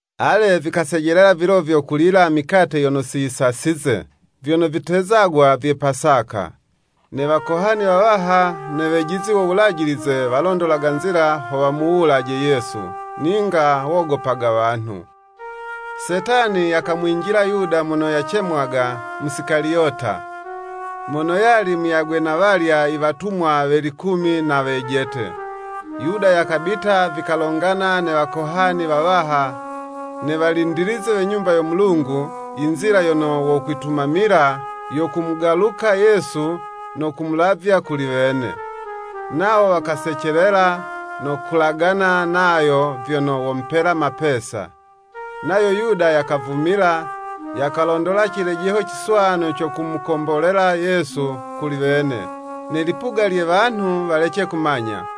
Ale vikasejelela vilo vyo kulila mikate yono siyisasize, vyono vitezagwa vye Pasaka. Ne Wakohani wawaha ne wejizi wo Wulajilize walondolaga nzila ho wamuwulaje Yesu: ninga wogopaga wanhu. Setani yakamwinjila Yuda mono yacemwaga Musikaliyota, mono yali muyagwe na walya i watumwa we likumi na wejete. Yuda yakabita, vikalongana ne wakohani wawaha ne walindilizi we Nyumba yo Mulungu, inzila yono wokwitumamila yo kumugaluka Yesu no kumulavya kuli wene. Nawo wakasecelela, no kulagana nayo vyono womupela mapesa. Nayo Yuda yakavumila, yakalondola cilejeho ciswanu co kumukombolela Yesu kuli wene, ne lipuga lye wanhu walece kumanya.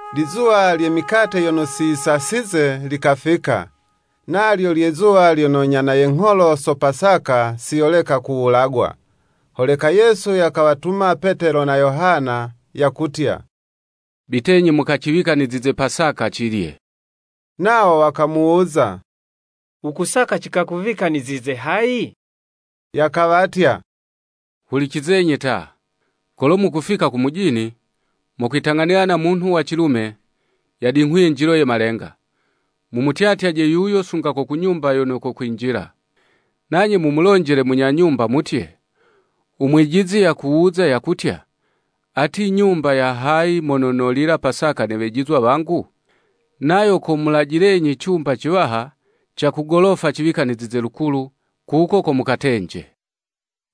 Lizuwa lye mikate yono siyisasize likafika. Nalyo lye zuwa lyono nyana ye ngholo so Pasaka si yoleka kuwulagwa. Holeka Yesu yakawatuma Petelo na Yohana, yakutya “Bitenyi mukaciwikanizize Pasaka, cilye.” Nawo wakamuwuza, “Wukusaka cikakuwikanizize hayi?” Yakawatya, “Hulicizenyi ta, kolo mukufika ku mujini, mokwitang'anila na munhu wa cilume, yadinghuye njilo ye malenga, mumutyatyaje yuyo sunga ko ku nyumba yono kokwinjila. Nanye mumulonjele munya nyumba mutye, ‘U Mwijizi yakuwuza, yakutya, Ati nyumba ya hayi, mono nolila Pasaka ne Wejizwa wangu?’ Nayo komulajilenyi cumba ciwaha ca ku golofa ciwikanizize lukulu, kuko ko mukatenje.”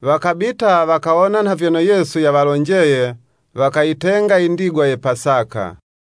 Wakabita, wakawona nha vyono Yesu yawalonjeye, wakayitenga i ndigwa ye Pasaka.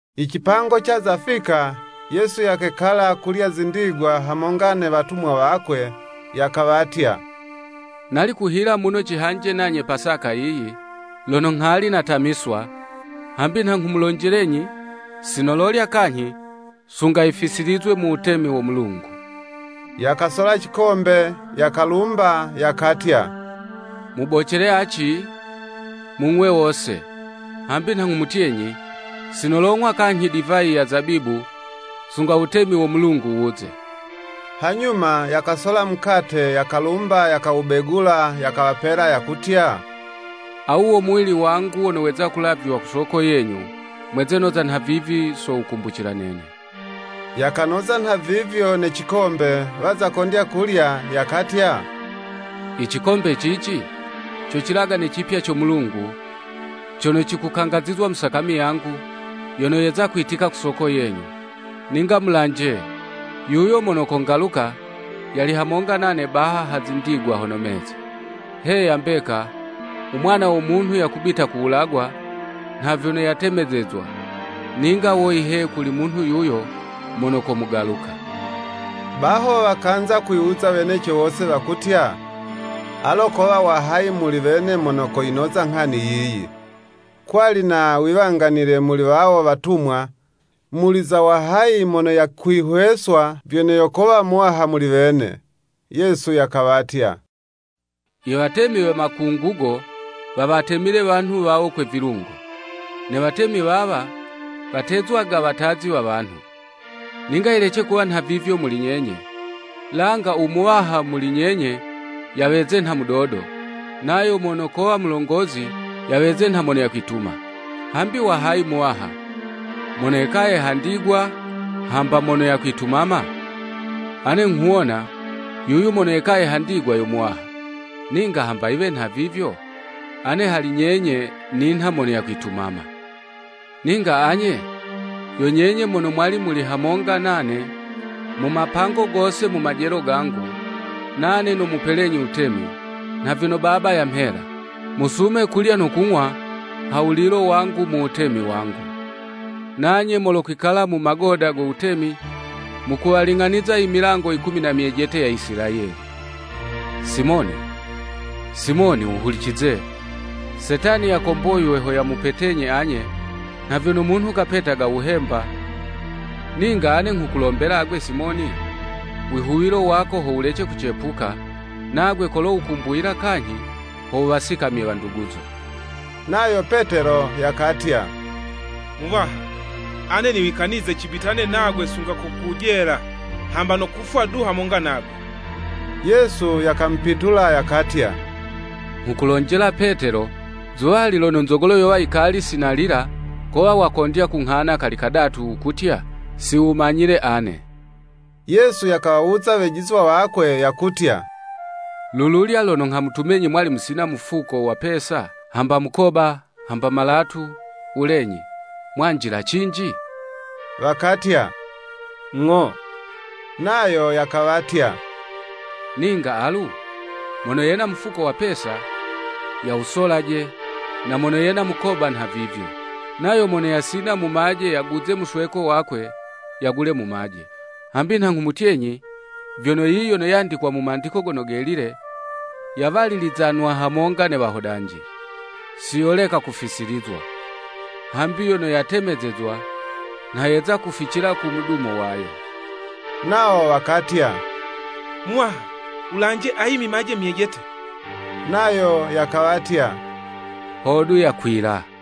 I cipango caza fika, Yesu yakekala kulya zindigwa hamonga ne watumwa wakwe. Yakawatya, “Nali kuhila muno cihanje nanye Pasaka yiyi, lono nghali natamiswa, hambi nha nghumulonjelenyi, si nololya kanyhi, sunga yifisilizwe mu wutemi wo Mulungu.” Yakasola cikombe, yakalumba, yakatya, “Mubocele aci, mung'we wose, hambi nha nghumutyenyi, si nolong'wa kanyhi divayi ya Zabibu sunga wutemi wo Mulungu wuze.” Hanyuma, yakasola mukate yakalumba yakawubegula, yakawapela, yakutya, [“Awu wo muwili wangu wono weza kulavywa ku soko yenyu, Mweze noza nha vivi so wukumbucila nene.” Yakanoza nha vivyo ne cikombe, waza kondya kulya, yakatya, “I cikombe cici, co cilagane cipya co Mulungu, cono cikukangazizwa mu sakami yangu, yono yeza kwitika ku soko yenyu.] “Ninga mulanje, yuyo mono kongaluka yali hamonga nane baha ha zindigwa hono meza. Heya mbeka, u Mwana wo Munhu yakubita kuwulagwa nha vyono yatemezezwa, ninga woyi he kuli munhu yuyo mono komugaluka.” Baho wakanza kwiwuza weneco wose, wakutya, “Alo kowa wa hayi muli wene mono koyinoza nghani yiyi.” Kwali na wiwanganile muli wawo watumwa, muli za wahayi mono yakwihweswa vyono yo kowa muwaha muli wene. Yesu yakawatya, “Iwatemi we Makungugo wawatemile wanhu wawo kwe vilungo. Ne watemi wawa, watezwaga watazi wa wanhu. Ninga yilece kuwa nhavivyo muli nyenye, langa u muwaha muli nyenye yaweze nha mudodo, nayo mono kowa mulongozi, yaweze nha mono yakwituma. Hambi wa hayi muwaha, mono yekaye ha ndigwa, hamba mono yakwitumama? Ane nghuwona, yuyu mono yekaye ha ndigwa yo muwaha. Ninga hamba yiwe nhavivyo, ane hali nyenye ninha mono yakwitumama. “Ninga anye yo nyenye mono mwali muli hamonga nane mu mapango gose mu majelo gangu, nane nomupelenyi wutemi, nha vyono Baba yamhela. Musume kulya no kung'wa ha wulilo wangu mu wutemi wangu. Nanye molokwikala mu magoda go wutemi mukuwaling'aniza i milango yikumi na myejete ya Isilayeli.” “Simoni, Simoni wuhulicize, Setani yakomboywe ho yamupetenyi anye nha vyono munhu kapetaga wuhemba, ninga ane nghukulombela agwe Simoni, wihuwilo wako ho wulece kucepuka; nagwe kolo wukumbuyila kanyhi, ho wuwasikamye wanduguzo.” Nayo Petelo yakatya, “Muwaha, ane niwikanize cibitane nagwe sunga ko ku jela, hamba no kufwa du hamonga nagwe.” Yesu yakamupitula yakatya, “Nghukulonjela Petelo, zuwali lono nzogolo yowa yikali sinalila, kowa wakondya kunghana kali kadatu wukutya, si wumanyile ane.” Yesu yakawawuza wejizwa wakwe yakutya “Lululya lono nghamutumenyi mwali musina mufuko wa mapesa, hamba mukoba, hamba malatu, wulenyi, mwanjila cinji?” Wakatya, “Ng'o.” Nayo yakawatya, “Ninga alu, mono yena mufuko wa pesa, yawusolaje, na mono yena mukoba nhavivyo. Nayo mono yasina mumaje yaguze musweko wakwe, yagule mumaje. Hambi nha nghumutyenyi, vyono yiyi yono yandikwa mu Mandiko Gono Gelile, ‘Yawalilizanwa hamonga ne wahodanji.’ Siyoleka kufisilizwa. Hambi yono yatemezezwa, nha yeza kuficila ku mudumo wayo.” Nawo wakatya, “Muwaha, wulanje, ayi mimaje myejete,” nayo yakawatya, “Hodu yakwila.”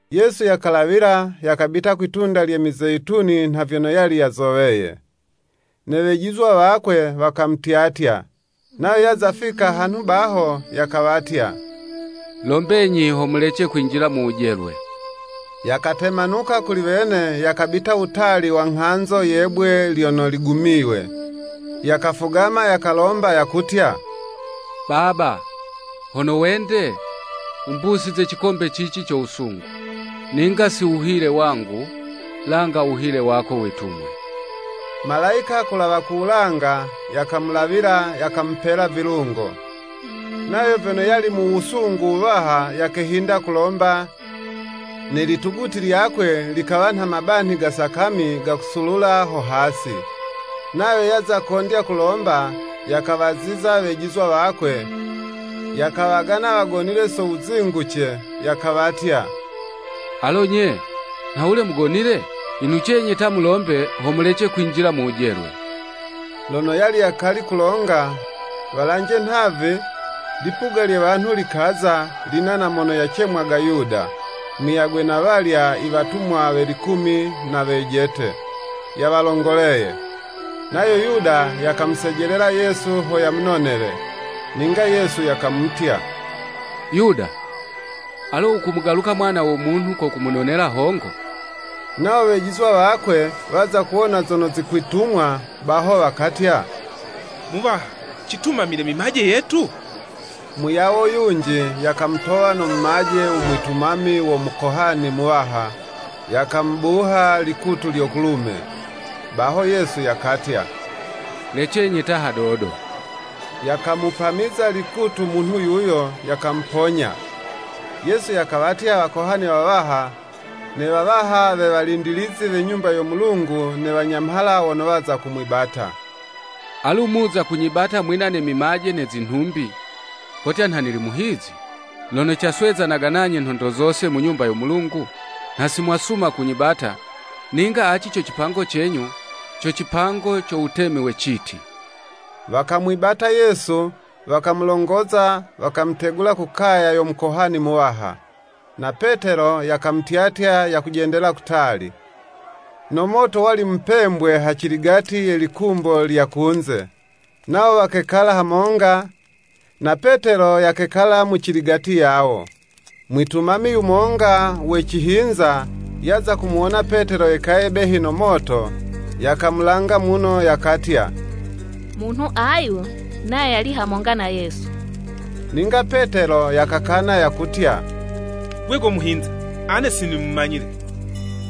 Yesu yakalawila, yakabita kwi'tunda lye Mizeyituni nha vyono yali yazoweye, ne wejizwa wakwe wakamutyatya. Nayo yaza fika hanhu baho, yakawatya, “Lombenyi ho mulece kwinjila mu wujelwe.” Yakatemanuka kuli wene yakabita wutali wa nghanzo ye'bwe lyono ligumiywe, yakafugama yakalomba, yakutya, “Baba, hono wende, wumbusize cikombe cici co Wusungu, ninga si wuhile wangu, langa wuhile wako witumwe.” [ Malayika kulawa ku wulanga, yakamulawila, yakamupela vilungo. Nayo vyono yali mu wusungu wuwaha, yakehinda kulomba, ne lituguti lyakwe, likawa nha mabanhi ga Sakami gakasulula ho hasi.] Nayo yaza kondya kulomba, yakawaziza wejizwa wakwe, yakawagana wagonile so wuzinguce, yakawatya, “Alo nye, nhawule mugonile? Inucenyi ta mulombe, ho mulece kwinjila mu wujelwe.” Lono yali yakali kulonga, walanje nhavi, lipuga lye wanhu likaza, lina na mono yacemwaga Yuda, muyagwe na walya, iwatumwa we likumi na wejete, yawalongoleye. Nayo Yuda yakamusejelela Yesu ho yamunonele. Ninga Yesu yakamutya, “Yuda, alo wukumugaluka Mwana wo Munhu ko wunonele hongo?” Nawo wejizwa wakwe waza kuwona zono zikwitumwa baho, wakatya, “Muwaha citumamile mimaje yetu?” Muyawo yunji yakamutowa no mumaje u mwitumami wo Mukohani muwaha, yakamubuha likutu lyo kulume. Baho Yesu yakatya, “Lecenyi ta hadodo.” Yakamupamiza likutu munhu yuyo, yakamuponya. Yesu yakawatya wakohani wawaha, ne wawaha we walindilizi we Nyumba yo Mulungu ne wanyamhala wono waza kumwibata. “Alu muza kunyibata mwina ne mimaje ne zinhumbi, kotya nha nili muhizi? Lono caswezanaga nanye nhondo zose mu Nyumba yo Mulungu, nha si mwasuma kunyibata, ninga aci co cipango cenyu, co cipango co wutemi we citi.” Wakamwibata Yesu, wakamulongoza, wakamutegula ku kaya yo Mukohani muwaha. Na Petelo yakamutyatya yakujendela kutali. No moto wali mupembwe haciligati ye likumbo lya kunze, nawo wakekala hamonga, na Petelo yakekala mu ciligati yawo. Mwitumami yumonga we cihinza, yaza kumuwona Petelo yekaye behi no moto, yakamulanga muno, yakatya, “Munhu ayu nayo yali hamonga na Yesu.” Ninga Petelo yakakana yakutya, “Gwe go muhinza! Ane sinimumanyile.”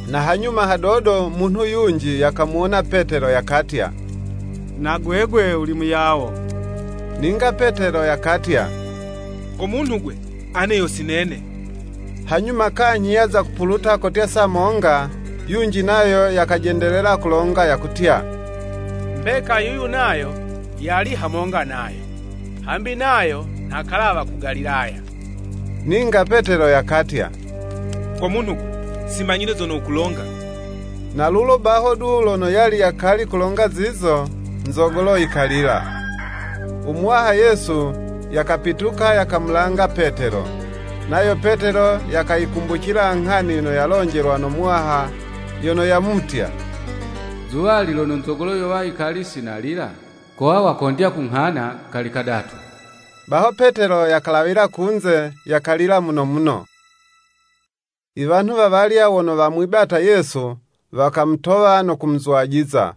Na hanyuma hadodo munhu yunji yakamuwona Petelo, yakatya, “Na gwegwe wuli muyawo.” Ninga Petelo yakatya, “Go munhu 'gwe, ane yo si nene.” Hanyuma kanyhi yaza kupuluta kotya saa monga, yunji nayo yakajendelela kulonga yakutya, “Mbeka yuyu nayo yali hamonga nayo, hambi nayo nha kalawa ku Galilaya.” Ninga Petelo yakatya, “Go munhu 'gwe, si manyile zono wukulonga.” Na lulo baho du lono yali yakali kulonga zizo, nzogolo yikalila. U Muwaha Yesu yakapituka yakamulanga Petelo. Nayo Petelo yakayikumbucila nghani yono yalonjelwa no Muwaha yono yamutya, “Zuwali lono nzogolo yowa yikali si nalila, kowa wakondya kunghana kali kadatu.” Baho Petelo yakalawila kunze, yakalila muno muno. I wanhu wawalya wono wamwibata Yesu, wakamutowa no kumuzwajiza.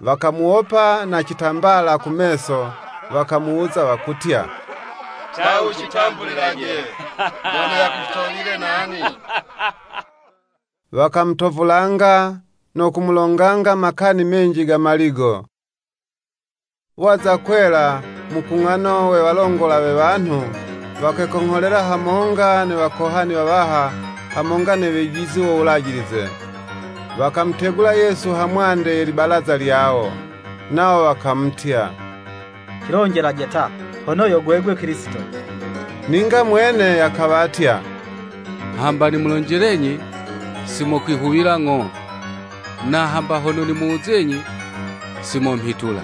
Wakamuwopa na citambala ku meso, wakamuwuza, wakutya, “Ta wucitambulilaje, mono yakutowile nani? Wakamutovulanga no kumulonganga makani menji ga maligo.” Waza kwela, mukung'ano we walongola we wanhu, wakekongholela hamonga ne Wakohani wawaha hamonga ne wejizi wo Wulajilize, wakamutegula Yesu hamwande ye libalaza lyawo. Nawo wakamutya, “Cilonjelaje ta, hono yo gwegwe Kilisito.” Ninga mwene yakawatya, “Hamba nimulonjelenyi, si mokwihuwila ng'o, na hamba hono nimuwuzenyi, si momhitula.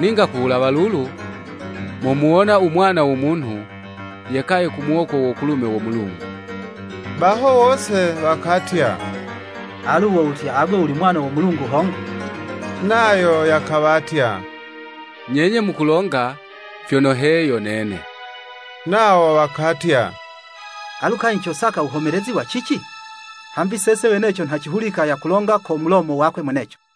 Ninga ku wulawa lulu, momuwona u Mwana wo Munhu yekaye ku muwoko wo kulume wo Mulungu.” Baho wose wakatya, “Alu wo wutya agwe wuli Mwana wo Mulungu hongo?” Nayo yakawatya, “Nyenye mukulonga vyono, he yo nene.” Nawo wakatya, “Alu kanyhi cosaka wuhomelezi wa cici? Hambi sese weneco nha cimuhulika yakulonga ko mulomo wakwe mweneco.”